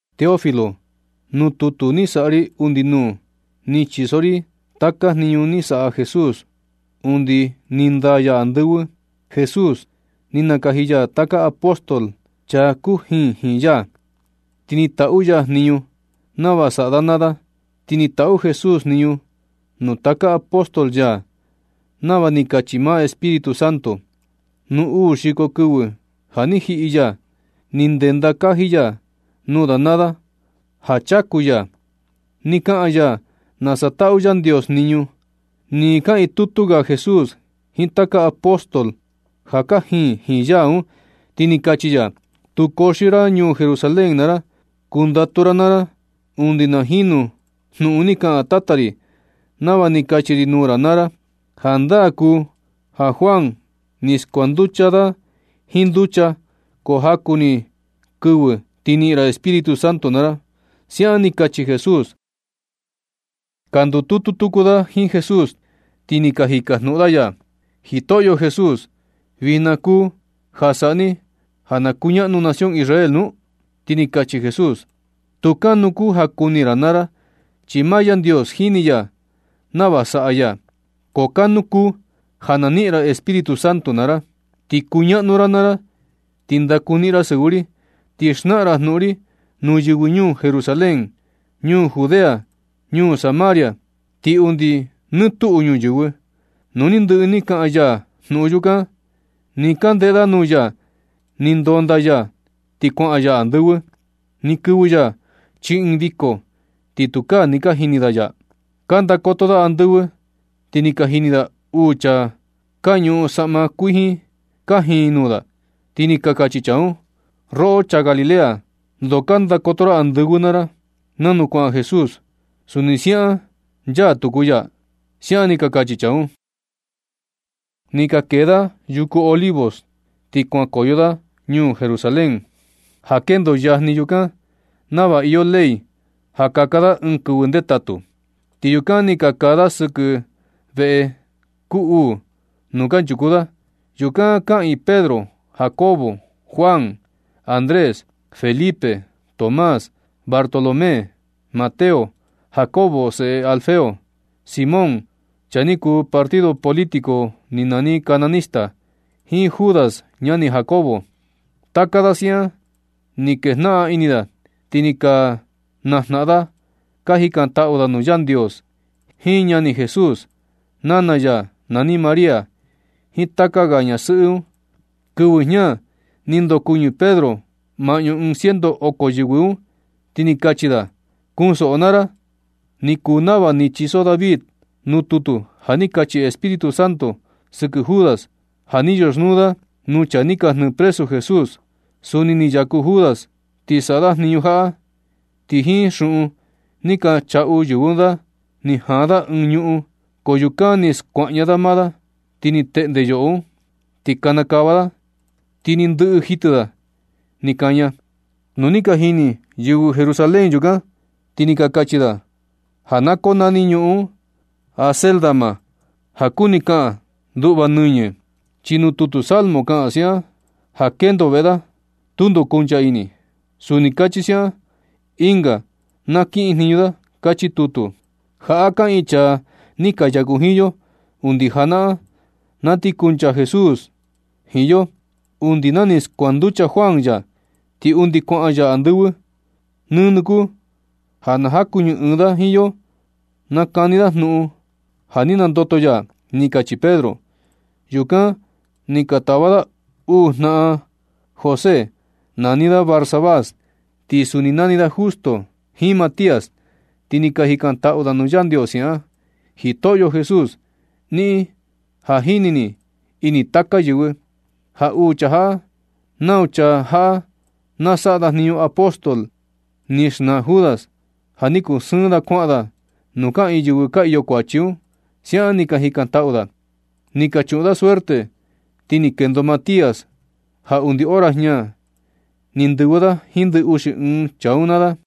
Teófilo, nuu tutu ni saꞌa ri undi nuu, ni chiso ri taka jniñu ni saꞌa Jesús undi ni ndaa ya andɨvɨ. Jesús ni nakaji ya taka apóstol, chaa kujiin jiin ya, ti ni taꞌu ya jniñu nava saꞌa da naa da. Ti ni taꞌu Jesús jniñu nuu taka apóstol ya nava ni kachi maa Espíritu Santo. Nuu uu xiko kɨvɨ ja ni jiꞌi ya, ni ndenda kaji ya nuu da naa da ja chaku ya. Ni kaꞌan ya nasa taꞌu Yandios jniñu. Nɨ kaꞌiin tutu ga Jesús jiin taka apóstol ja kajiin jiin ya un, ti ni kachi ya: ―Tu kuxio ra ñuu Jerusalén naa ra. Kundatu ra naa ra undi na jinu jnuꞌun ni kaꞌan Tata ri, nava ni kachi ri nuu ra naa ra. Jandaa kuu ja Juan ni skuanducha da jiin nducha, ko jaku ni kɨvɨ ti niꞌin ra Espíritu Santo naa ra ―siaꞌan ni kachi Jesús. Ka ndututu tuku da jiin Jesús, ti ni ka jikajnuꞌun da ya: ―¿Jitoꞌyo Jesús, vijna kuu ja saꞌa ni ja na kuñaꞌnu nación Israel nu? Ti ni kachi Jesús: ―Tu kanu kuu ja kuni ra naa ra, chi maa Yandios jini ya nava saꞌa ya. Ko kanu kuu ja na niꞌin ra Espíritu Santo naa ra. Ti kuñaꞌnu ra naa ra, ti ndakuniꞌin ra sɨvɨ ri, ti xnaꞌan ra jnuꞌun ri nuu yɨvɨ ñuu Jerusalén, ñuu Judea, ñuu Samaria, ti undi nuu nɨ tuꞌu ñuyɨvɨ. Nu ni ndɨꞌɨ ni kaꞌan ya jnuꞌun yukan, nɨ ka ndeꞌe da nuu ya, ni ndondaa ya ti kuaꞌan ya andɨvɨ. Ni kɨvɨ ya chii ɨɨn viko, ti tukaa ni ka jini da ya. Ka ndakoto da andɨvɨ ti ni ka jini da uu chaa ka ñuꞌun saꞌma kuijin kajiin nuu da. Ti ni ka kachi chaa un: ―Roꞌo chaa Galilea, ndoo ka ndakoto ra andɨvɨ naa ra. Nanu kuaꞌan Jesús, suni siaꞌan nchaa tuku ya ―siaꞌan ni ka kachi chaa un. Ni ka kee da yuku Olivos, ti kuankoyo da ñuu Jerusalén ja kendo yajni yukan, nava iyo ley ja kaka da ɨɨn kɨvɨ ndetatu. Ti yukan ni ka kaa da sɨkɨ veꞌe kuu uu nuu kanchuku da. Yukan kaꞌiin Pedro, Jacobo, Juan, Andrés, Felipe, Tomás, Bartolomé, Mateo, Jacobo seꞌe Alfeo, Simón, chaa ni kuu partido político ni nani cananista, jiin Judas ñani Jacobo. Taka da siaꞌan ni kejnaꞌan ini da, ti ni ka najnaꞌan da ka jikantaꞌu da nuu Yandios jiin ñani Jesús, nana ya nani María, jiin taka ga ñasɨꞌɨ un. Kɨvɨ jña ni ndokuɨñɨ Pedro maꞌñu ɨɨn ciento oko yɨvɨ un, ti ni kachi da: ―Kuunsoꞌo naa ra, ni kuu nava ni chiso David nuu tutu ja ni kachi Espíritu Santo sɨkɨ Judas, ja ni yoxnuu da nuu chaa ni ka jnɨɨ presu Jesús. Suni ni yaku Judas ni saꞌa da jniñu jaꞌa. Ti jiin xuꞌun ni ka chaꞌu yɨvɨ un da, ni jaan da ɨɨn ñuꞌun, ko yukan ni skuaꞌña da maa da, ni teꞌnde yoꞌo un, ni kanakava da, ti ni ndɨꞌɨ jitɨ da ni kaña. Nu ni ka jini yɨvɨ Jerusalén yukan, ti ni ka kachi da ja na konani ñuꞌun un Acéldama, ja kuni kaꞌan nduꞌva nɨñɨ. Chi nuu tutu Salmo kaꞌan siaꞌan: Na kendo veꞌe da, tundo kuncha ini. Suni kachi siaꞌan: Ɨnga na nakiꞌin jniñu da. Kachi tutu. Jaꞌa kaꞌiin chaa ni ka yaku jiin yo undi janaꞌan na ni kuncha Jesús jiin yo, undi na ni skuanducha Juan ya, ti undi kuaꞌan ya andɨvɨ. Nɨnɨ kuu ja na nukuɨñɨ ɨɨn da jiin yo na kani da jnuꞌun ja ni nandoto ya ―ni kachi Pedro. Yukan ni ka tava da uu jnaꞌan da un, José nani da Barsabás ti suni nani da Justo, jiin Matías. Ti ni ka jikantaꞌu da nuu Yandios siaꞌan: ―Jitoꞌyo Jesús, niꞌin ja jini ni ini taka yɨvɨ. Ja uu chaa jaꞌa, nau chaa jaꞌa na saꞌa da jniñu apóstol ni xnaa Judas, ja ni kuu sɨɨn da kuaꞌan da nuu kaꞌiin yɨvɨ ka iyo kuachi un ―siaꞌan ni ka jikantaꞌu da. Ni ka chuꞌun da suerte, ti ni kendo Matías ja undi hora jña ni ndɨvɨ da jiin ndɨ uxi ɨɨn chaa un naa da.